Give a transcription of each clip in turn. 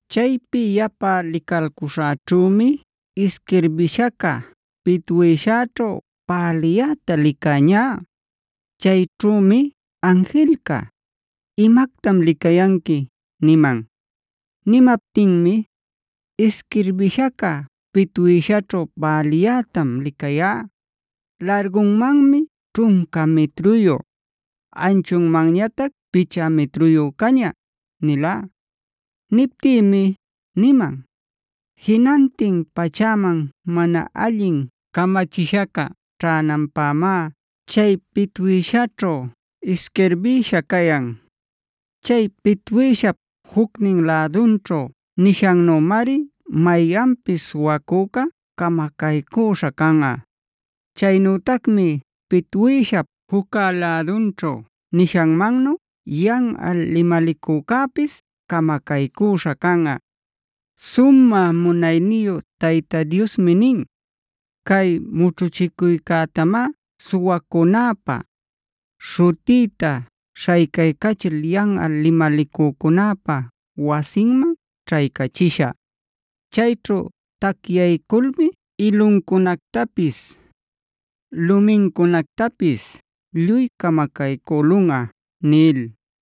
Chaypi yapa licalcuśhäćhümi isquirbishaca pitwïshaćhu päliyäta licäñá. Chayćhümi anjilca: “¿Imactam licayanqui?” niman. Nimaptinmi: “Isquirbishaca pitwïshaćhu päliyätam licayá. Largunmanmi ćhunca mitruyu, anchunmanñatac picha mitruyu caña” nilá. Niptïmi niman: “Jinantin pachäman mana allin camachishaca ćhänanpämá chay pitwïshaćhu isquirbïsha cayan. Chay pitwïshap jucnin lädunćhu nishannümari mayanpis suwacücá camacaycüśha canꞌa. Chaynütacmi pitwïshap juccä lädunćhu nishanmannu yanꞌal limalicücäpis camacaycüśha canꞌa. Sumä munayniyu Tayta Diosmi nin: ‘Cay mućhuchicuycätamá suwacücunäpa, śhutïta śhaycaycachil yanꞌal limalicücunäpa wasinman ćhaycachishä. Chayćhu tacyayculmi iluncunactapis, lumincunactapis lluy camacaycülunꞌa’” nil.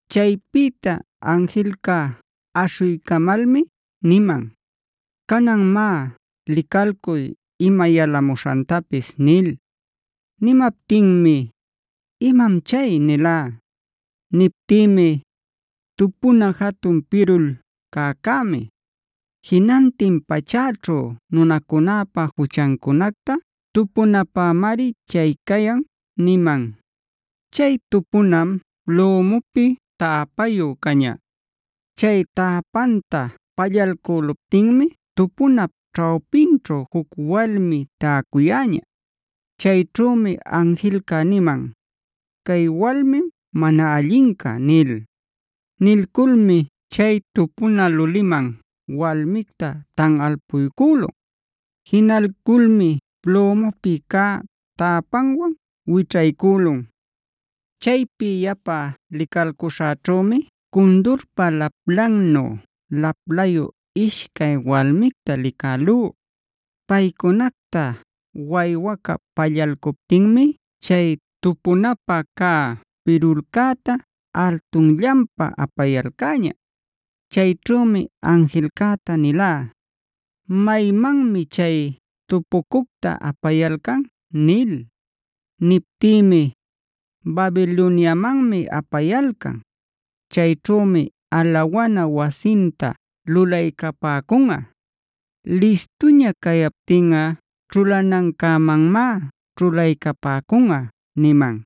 Chaypïta anjilca aśhuycamalmi niman: “Canan má licalcuy ima yalamuśhantapis” nil. Nimaptinmi: “¿Imam chay?” nilá. Niptïmi: “Tupuna jatun pirul cäcämi. Jinantin pachäćhu nunacunäpa juchancunacta tupunapämari chay cayan” niman. Chay tupunam plümupi täpayu caña. Chay täpanta pallalcüluptinmi tupunap ćhawpinćhu juc walmi täcuyäña. Chayćhümi anjilca niman: “Cay walmim mana allinca” nil. Nilculmi chay tupuna luliman walmicta tanꞌalpuycülun. Jinalculmi plümupi cä täpanwan wićhaycülun. Chaypi yapa licalcuśhäćhümi cundurpa laplannu laplayu ishcay walmicta licälú. Paycunacta waywaca pallalcuptinmi chay tupunapä cä pirulcäta altunllanpa apayalcäña. Chayćhümi anjilcäta nilá: “¿Maymanmi chay tupucucta apayalcan?” nil. Niptïmi: “Babiloniamanmi apayalcan; chayćhümi alawana wasinta lulaycapäcunꞌa. Listuña cayaptinꞌa ćhulanancämanmá ćhulaycapäcunꞌa” niman.